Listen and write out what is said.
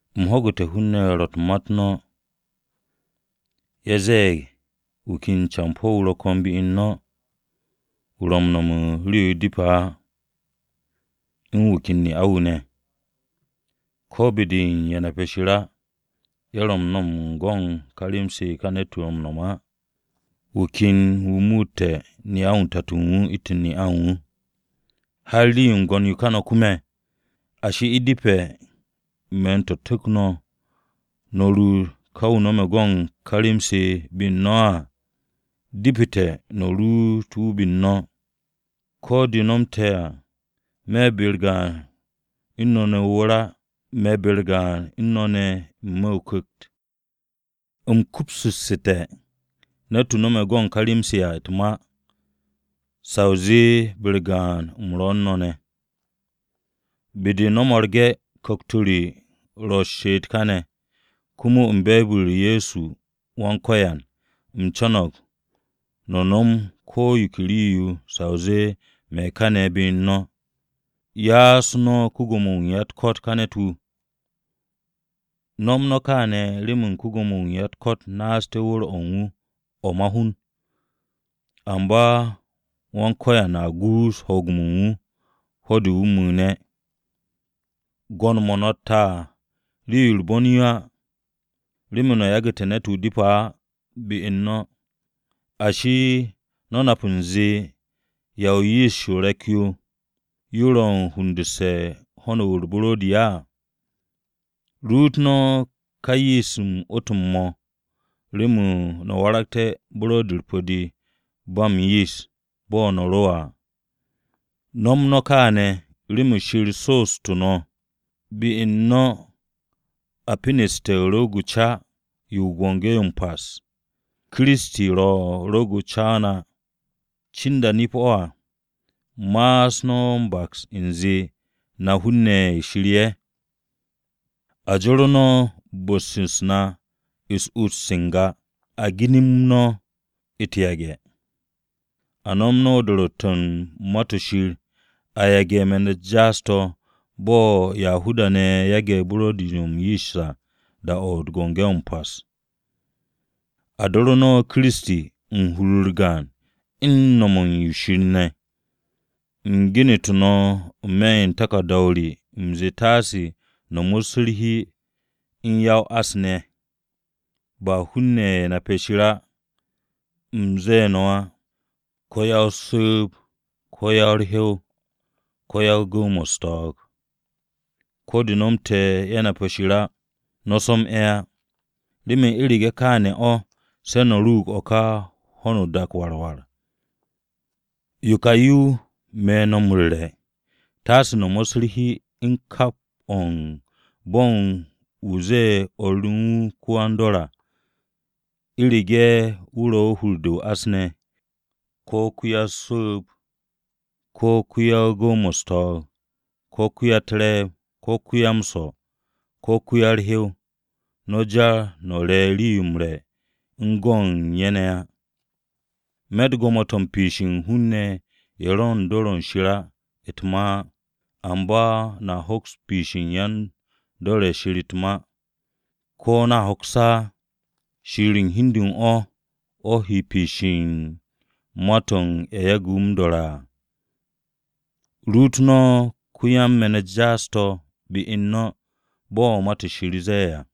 U̱m ho̱gu̱te̱ hun-ne̱ ro̱ u̱n ma-u̱t no̱. Ye̱ ze̱e̱g wu̱ ken campo̱-wu̱ ro̱ ko̱n be u̱n no̱. Wu̱ ro̱ u̱n no̱m u̱n yo depe̱ á, u̱n wu̱ ken ne'a-wu̱ ne̱. Ko̱ be-de u̱n ye̱ nape̱ Shir á, ye̱ ro̱ m-no̱m u̱n go̱ u̱n ka rem-se ka ne̱t-wu̱ no̱me̱ á. Wu̱ ken wu̱ muute̱ ne'a tato u̱n wu̱ u̱ntu̱n ne'a u̱n wu̱. Har rii-yo m-gwo̱n yo ká no̱ kume̱! Ashi, ¿u̱depe̱ me̱n-to̱ tu̱k no̱, no̱ ruut ká wu̱ no̱me̱ go̱ u̱n ká rem-se be u̱n no̱ á? Depete̱ no̱ ruut wu̱ be u̱n no̱. Ko̱ de̱ nomte̱ à, me̱ be-u̱r gaan u̱n no̱ ne̱ o-wu̱r á, me̱ be-u̱r gaan u̱n no̱ ne̱ n-me̱ o-ku̱kt. U̱m kupsu̱ssu̱te̱ ne̱t-wu̱ no̱me̱ go̱ u̱n ká rem-se à u̱t-ma sa o zee be-u̱r gaan u̱m ro̱ u̱n no̱ ne̱. Be-de no̱ mo̱rge̱ ku̱kt-o re ro̱ m-she'et káne̱, komo u̱n be̱e̱b-u̱r Ye̱so Wan-Ko̱yan, u̱m co̱no̱g no̱ nom ko̱ yo ke rii-yo sa o zee me̱ kaane̱ be u̱n no̱. Ya'as no̱ ko-Gwo̱mo-wu̱ u̱n ya-u̱t-ko̱t ká campo̱-wu̱. No̱m no̱ kaane̱ remen ko-Gwo̱mo-wu̱ u̱n ya-u̱t-ko̱t naaste̱ wu̱r-o̱ u̱n wu̱ o̱ ma-hun, amba Wan-Ko̱yan a guus ho̱o̱g-mo̱ u̱n wu̱ ho̱-de wu̱ mu̱u̱ne̱. Gwo̱n-mo̱ no̱tte̱ à rii-yo u̱r-bon yo á, remen no̱ yagu̱te̱ ne̱t-wu̱ depe̱ á be-u̱r no̱. Ashi, ¿no̱ nap u̱nze, ya o-yist o-re̱k yo ro̱ u̱n hundu̱nse̱ u̱n ho̱n u̱r-buro̱di á? Ruut no̱ ká yist-m 'wu̱tu̱m-mo̱ remen no̱ waragté̱ buro̱di-u̱r pu̱-de ba m-yist bo̱ no̱ ro à. No̱m no̱ kaane̱ remen Shir so'ostu̱ no̱, be u̱n no̱ a peneste̱ rwu̱u̱g o-ca yo u̱n Biki-o̱ m-Pas. Kiristi ro̱ rwu̱u̱g-o̱ ca-o na. Cinda nip-o̱ à, ma'as no̱ m-baks u̱nze na hun-ne̱ ye̱ Shir ye̱. A joro no̱ bu̱-u̱s na u̱s-ut se n-ga. A ginim no̱ u̱t-yage̱. A nom no̱ do̱ro̱tte̱-o̱ u̱n Ma-to̱ Shir a yage̱ me̱n-u̱t jaas-to̱ bo̱ Yahuda-ne̱ yage̱ buro̱di-to̱ m-yist à da-o̱ u̱n Biki-o̱ m-Pas. A do̱ru̱ no̱ Kiristi hur-u̱r gaan u̱n no̱m o-shir ne̱. U̱m genu̱tu̱ no̱ n-me̱ u̱n taku̱rda-o re, u̱m zee taase no̱ mo̱sse̱ u̱r-hi u̱n ya-o-ás ne̱. Ba hun-ne̱ ye̱ nape̱ Shir á u̱m ze̱e̱ no̱ á, ko̱ ya-o-su̱u̱b, ko̱ ya-u̱r-hyow, ko̱ yan-gu̱w-mo̱ u̱s-to̱o̱g. Ko̱ de̱ nomte̱ ye̱ nap Shir á no̱ so̱m ye̱ á. Remen u̱rege̱ kaane̱ o̱ se̱ no̱ ruug u̱n kà ho̱no o-dak o̱ war war. Yo ka yo me̱ no̱ m-ru̱re̱: taase no̱ mo̱sse̱ u̱r-hi u̱n kap o̱ u̱n bo̱n wu̱ ze̱e̱ o̱r no̱ wu̱ ko-yan-dor à, u̱rege̱ wu̱ ro̱ u̱n hur-de o-ás ne̱, ko̱ ko-ya-o-su̱u̱b, ko̱ ko-yan-gu̱w-mo̱ u̱s-to̱o̱g, ko̱ wa-u̱t-re̱e̱b, ko̱ ko-ya-m-swo̱, ko̱ ko-hyow. No̱ jar no̱ re rii-yo m-re̱ u̱n go̱ u̱n ye̱ ne̱ á. Me̱tt gwo̱mo-to̱ u̱n piishe̱ u̱n hun-ne̱ ye̱ ro̱ u̱n dor o̱ u̱n Shir á u̱t-ma á. Amba no̱a hoks piishe̱ u̱n yan-dor o̱ Shir u̱t-ma. ¿Ko̱ no̱ hoks á? Shir o̱ u̱n hi u̱n de u̱n o̱ he piish u̱n ma-to̱ u̱n ye̱ yage̱ wu̱ m-do̱re̱ á. “Ruut no̱ ko-yan-me̱n-u̱t jaas-to̱ be-u̱r no̱” bo̱ Ma-to̱ Shir ze̱e̱ à.